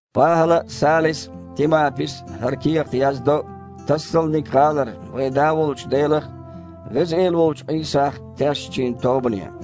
ПахІала а, Салис а, Тимапис а хІара кехат яздо Тассалник-гІалара вайн Да волчу Делах а, Веза Эла волчу Іийсах а тешначийн тобане.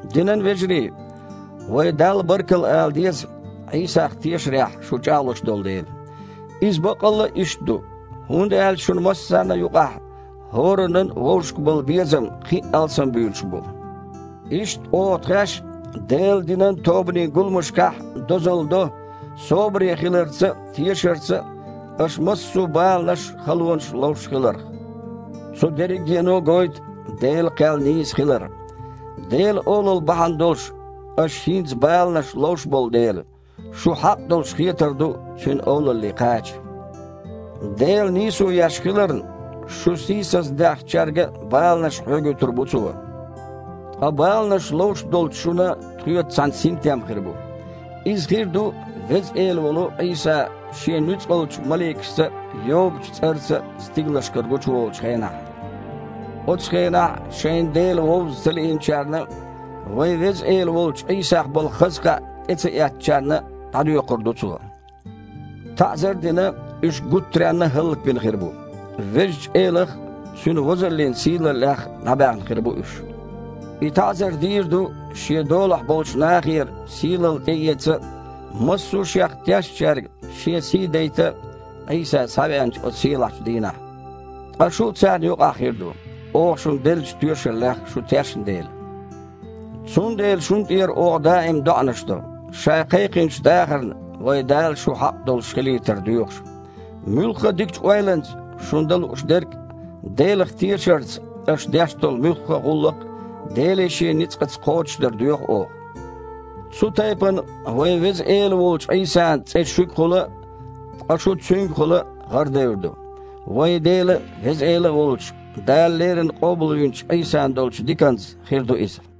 Динан вежарий! Вай Далла баркалла ала деза, Іийсах тешарехь шу чІагІлуш долу дела. Иза баккъалла а иштта ду, хІунда аьлча шуна массарна а юкъахь хІораннан а вовшашка болу безам кхин а алсамбуьйлуш бу. Иштта, оха тхаьш а Делан динан тобанийн гуламашкахь дозалла до собаре хиларца а, тешарца а аша массо а баланаш а, халонаш а ловш хиларх. Цу дерригено а гойту Делан кхел нийса хилар. Делан олалла бахьана долуш аша хІинца баланаш ловш болу дела, шу хьакъ долуш хетар ду Цуьнан олалле кхача. Дела нийсо еш хиларна, шу сийсаздаьхначаьрга а баланаш хьоьгуьйтур бу Цо, ткъа баланаш ловш долчу шуна тхоьца цхьаьна синтем хир бу. Иза хир ду Веза Эла волу Іийса Шен нуьцкъалчу маликашца а, йогучу цІарца а стигалшкара гучуволучу хенахь. Оцу хенахь шайна Дела вовза ца лиинчарна а, вайн Веза Эла волчу Іийсах болу хаза кхаъ тІе ца эцначарна а дІадоькхур ду Цо. ТаІзар а дина, уьш гуттаренна а хІаллакбина хир бу. Везачу Элах а, Цуьнан возаллин сийлаллех а дІабаьхна хир бу уьш. И таІзар дийр ду Шен долахь болчу нахера сийлалла тІеэца а, массо а Шех тешначаьрга Шен сий дайта а Іийса схьавеанчу оцу сийлахьчу дийнахь. Ткъа шу а царна юкъахь хир ду, оха шуна деллачу тоьшаллех шу тешна дела. Цундела шуна тІера оха даим доІанаш до, Ша кхайкхинчу дахарна вайн Дала шу хьакъ долуш хилийтар доьхуш. Муьлхха а дикачу ойланца шуна дан лууш дерг а, Делах тешарца аша деш долу муьлхха а гІуллакх а Деле Шен ницкъаца кхочушдар доьху оха. Цу тайпана вайн Веза Эла волчу Іийсан цІе шуьгахула а, ткъа шу Цуьнгахула а гІарадевр ду. Вайн Дела а, Веза Эла а волчу, Дала леррина къобалвинчу Іийсан долчу диканца хир ду иза.